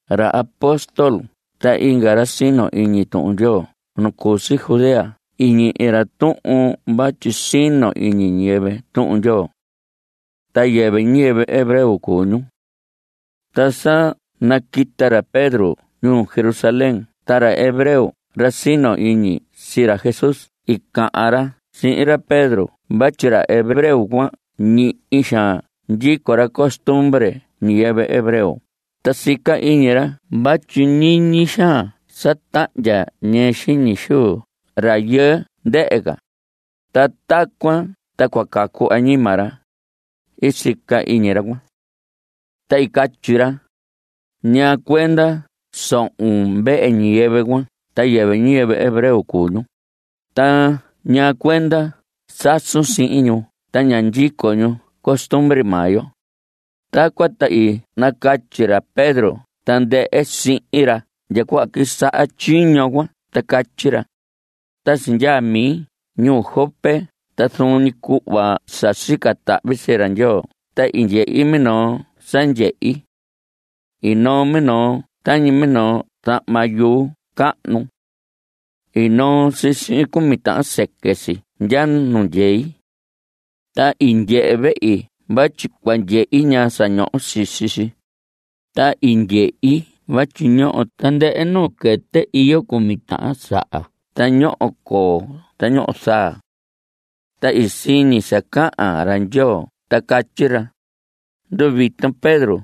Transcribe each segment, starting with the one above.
Ra apóstol ta inga ra sino iñi Tuhun Ndyoo nu cu si Judea i ñihi ra tuhun vatyi sino iñi ñiyɨvɨ Tuhun Ndyoo. Ta yɨvɨ ñiyɨvɨ hebreo cuu ñu. Ta sa naquita ra Pedro ñuu Jerusalén ta ra hebreo ra sino iñi sii ra Jesús i cahan ra sii ra Pedro vatyi ra hebreo cuan ñihi xaan ndyico ra costumbre ñiyɨvɨ hebreo ta sica iñi ra vatyi ñiñi xaan sa tahndya ñɨɨ xiñi xuu rayɨɨ ndɨhɨ ca, ta tacuan ta cua cacu añima ra, sica iñi ra cuan. Ta i catyi ra: ¿Ñaa cuenda sohon vehe ñiyɨvɨ cuan ta yɨvɨ ñiyɨvɨ hebreo cuu ñu? ¿Ta ñaa cuenda sasun sihin ñu ta ña ndyico ñu costumbre maa yo? Tacuan ta i nacatyi ra Pedro tandɨhɨ sihin ra ndya cuhva quisaha tyiño cuan ta catyi ra: Ta sindyaa mi ñuu Jope ta zuun ñi cuhva sa sica tahvi sii ra Ndyoo ta i ndyehi minoo sa ndyehi. I noo minoo tañi minoo zahma yuu cahnu. I noo si sihin cumi tahan sɨquɨ si ndya nu ndyei. Ta i ndyehe vehi vatyi cua ndyehi ñaa sa ñoho sisi si, ta i ndyehi vatyi ñoho tandɨhɨ nuu quɨtɨ iyo cumi tahan saha ta ñoho coo ta ñoho zaa. Ta i siñi sa cahan ra Ndyoo ta catyi ra: “Nduviton Pedro.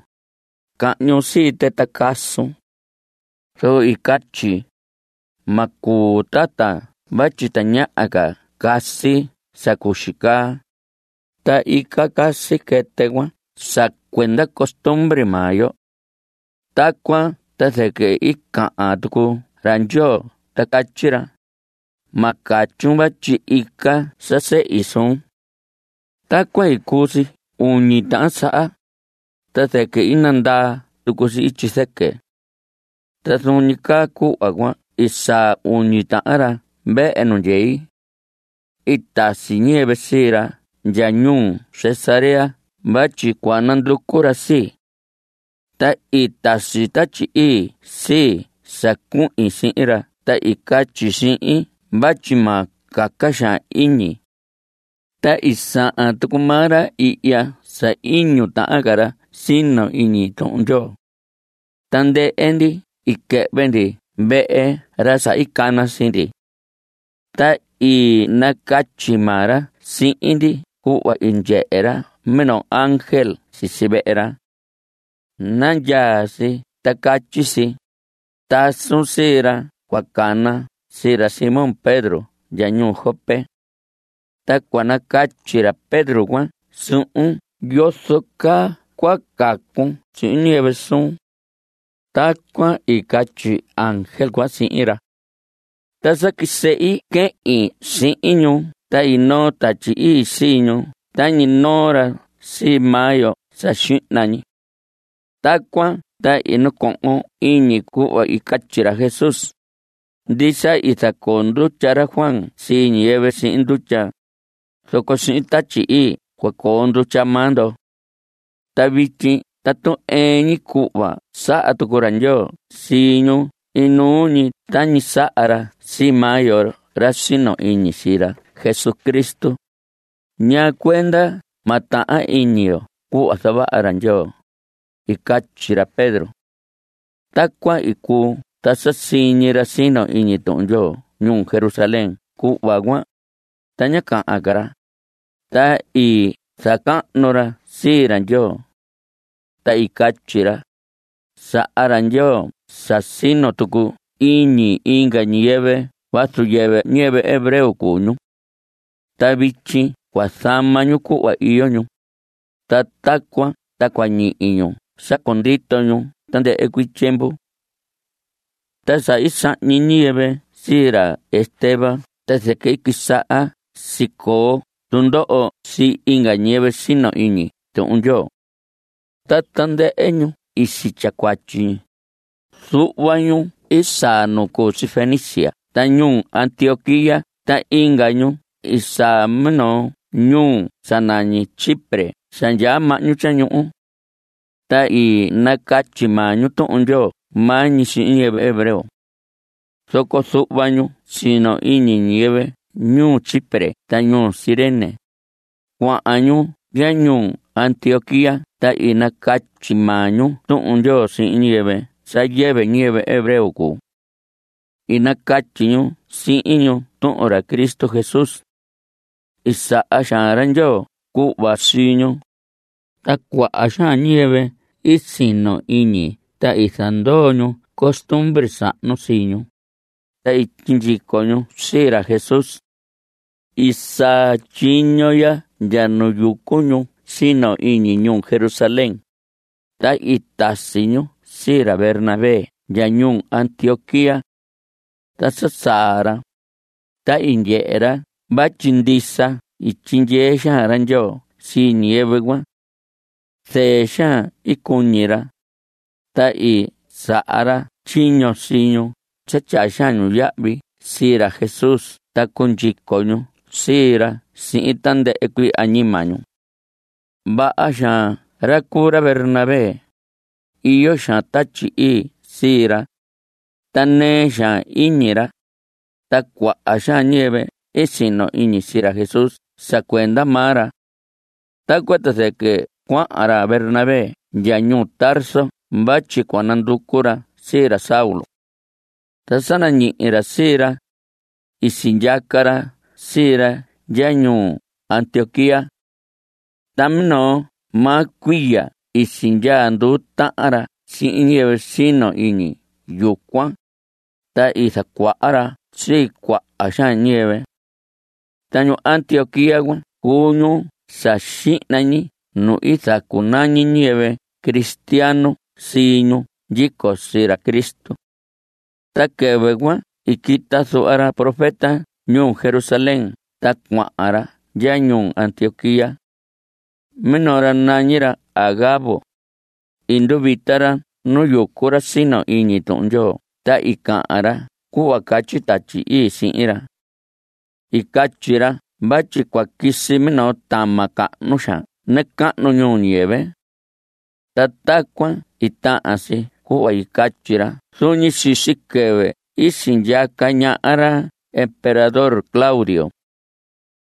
Cahñun sii tɨ ta casun.” Zoco i catyi: “Ma cuu tata vatyi tañaha ca casi sa cuxi caa.” (Ta ica casi quɨtɨ cuan sa cuenda costumbre maa yo.) Tacuan ta zɨquɨ i cahan tucu ra Ndyoo ta catyi ra: “Ma catyun vatyi ica sa sehi suun.” Tacuan i cuu si uñi tahan saha, ta zɨquɨ i nandaa tucu si ityi zɨquɨ. Ta zuun ñi caa cuhva cuan i saa uñi tahan ra vehe nu ndyei. I tasi ñiyɨvɨ sii ra ndya ñuu Cesarea vatyi cua nanducu ra sii. Ta i tasi Tatyi Ii sii sa cuhin sihin ra ta i catyi si sihin vatyi ma caca xaan iñi. Ta i sahan tucu maa ra ihya sa iñu tahan ca ra sino iñi Tuhun Ndyoo. Tandɨhɨ ndi i quɨhvɨ ndi vehe ra sa i cana sii ndi. Ta i nacatyi maa ra sihin ndi cuhva i ndyehe ra minoo ángel sisi vehe ra. Nandyaa si ta catyi si: “Tasun sii ra cua cana sii ra Simón Pedro ndya ñuu Jope. Ta cua nacatyi ra Pedro cuan suhun yozo caa cua cacun sihin ñiyɨvɨ suun.” Tacuan i catyi ángel cuan sihin ra. Ta sa quisehi quehin sihin ñu ta i noo Tatyi Ii sii ñu tañi i noo ra sii maa yo sa xihna ñi. Tacuan ta i nacohon iñi cuhva i catyi ra Jesús: “Ndisa i zacoo ndutya ra Juan sii ñiyɨvɨ sihin ndutya, zoco sihin Tatyi Ii cua coo ndutya maa ndo.” Ta vityi tatu ɨɨn ñi cuhva saha tucu ra Ndyoo sii ñu inuu ñi tañi saha ra sii maa yo ra sino iñi sii ra Jesucristo, ¿ñaa cuenda ma tahan iñi yo cuhva zavaha ra Ndyoo? I catyi ra Pedro. Tacuan i cuu ta sa siñi ra sino iñi Tuhun Ndyoo ñuu Jerusalén cuhva cuan, ta ñá cahan ca ra, ta i zacahnu ra sii ra Ndyoo. Ta i catyi ra: Saha ra Ndyoo sa sino tucu iñi inga ñiyɨvɨ vazu yɨvɨ ñiyɨvɨ hebreo cuu ñu. Ta vityi cua zama ñu cuhva iyo ñu, ta tacuan ta cua ñihi ñu sa cundito ñu tandɨhɨ cuii tyiemvu. Ta sa i sahñi ñiyɨvɨ sii ra Esteban ta zɨquɨ i quisaha sicoo tundoho sii inga ñiyɨvɨ sino iñi Tuhun Ndyoo. Ta tandɨhɨ ñu i sitya cuatyi. Zuhva ñu i saa nu cu si Fenicia ta ñuu Antioquía ta inga ñu i saa minoo ñuhu sa nañi Chipre sa ndyaa mahñu tyañuhu. Ta i nacatyi maa ñu Tuhun Ndyoo maa ñi sihin ñiyɨvɨ hebreo. Zoco zuhva ñu sino iñi, ñiyɨvɨ ñuu Chipre ta ñuu Cirene, cuahan ñu ndya ñuu Antioquía ta i nacatyi maa ñu Tuhun Ndyoo sihin ñiyɨvɨ sa yɨvɨ ñiyɨvɨ hebreo cuu. I nacatyi ñu sihin ñu tuhun ra Cristo Jesús. I saha xaan ra Ndyoo cuhva sii ñu, ta cuaha xaan ñiyɨvɨ i sino iñi ta i zandoo ñu costumbre sahnu sii ñu. Ta i sindyico ñu sii ra Jesús. I saa tyiño ya ndya nu yucu ñu sino iñi ñuu Jerusalén, ta i tasi ñu sii ra Bernabé ndya ñuu Antioquía. Ta sa saa ra, ta i ndyehe ra vatyi ndisa i tyindyee xaan ra Ndyoo sii ñiyɨvɨ cuan. Zɨɨ xaan i cuñi ra, ta i saha ra tyiño sii ñu sa tyaa xaan ñu yahvi sii ra Jesús ta cundyico ñu sii ra sihin tandɨhɨ cuii añima ñu. Vaha xaan ra cuu ra Bernabé, iyo xaan Tatyi Ii sii ra, ta nɨɨ xaan iñi ra. Ta cuaha xaan ñiyɨvɨ i sino iñi sii ra Jesús sa cuenda maa ra. Tacuan ta zɨquɨ cuahan ra Bernabé ndya ñuu Tarso vatyi cua nanducu ra sii ra Saulo. Ta sa nañihi ra sii ra, i sindyaca ra sii ra ndya ñuu Antioquía. Ta minoo maa cuiya i sindyaa nduu tahan ra sihin ñiyɨvɨ sino iñi yucuan, ta i zacuaha ra sii cuaha xaan ñiyɨvɨ. Ta ñuu Antioquía cuan cuu ñuu sa xihna ñi nu i zacunañi ñiyɨvɨ cristiano sii ñu ndyico sii ra Cristo. Ta quɨvɨ cuan i quita zuhva ra profeta ñuu Jerusalén ta cuahan ra ndya ñuu Antioquía. Minoo ra nañi ra Agabo. I nduvita ra nu yucu ra sino iñi Tuhun Ndyoo ta i cahan ra cuhva catyi Tatyi Ii sihin ra. I catyi ra vatyi cua quisi minoo tama cahnu xaan nacahnu ñuu ñiyɨvɨ. Ta tacuan i tahan si cuhva i catyi ra zuun ñi sisi quɨvɨ i sindyaca ñaha ra emperador Claudio.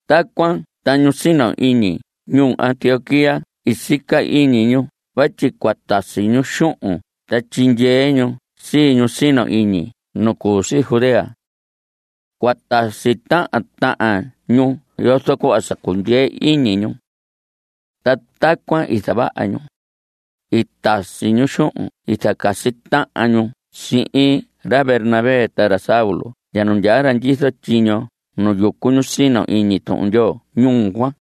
Tacuan ta ñu sino iñi ñuu Antioquía i sica iñi ñu vatyi cua tasi ñu xuhun ta tyindyee ñu sii ñu sino iñi nu cu si Judea. Cua tasi tahan tahan ñu yozo cuhva sa cundyee iñi ñu. Ta tacuan i zavaha ñu. I tasi ñu xuhun i zacasi tahan ñu sihin ra Bernabé ta ra Saulo ndya nu ndyaa ra ndyizo tyiño nu yucu ñu sino iñi Tuhun Ndyoo ñuu cuan.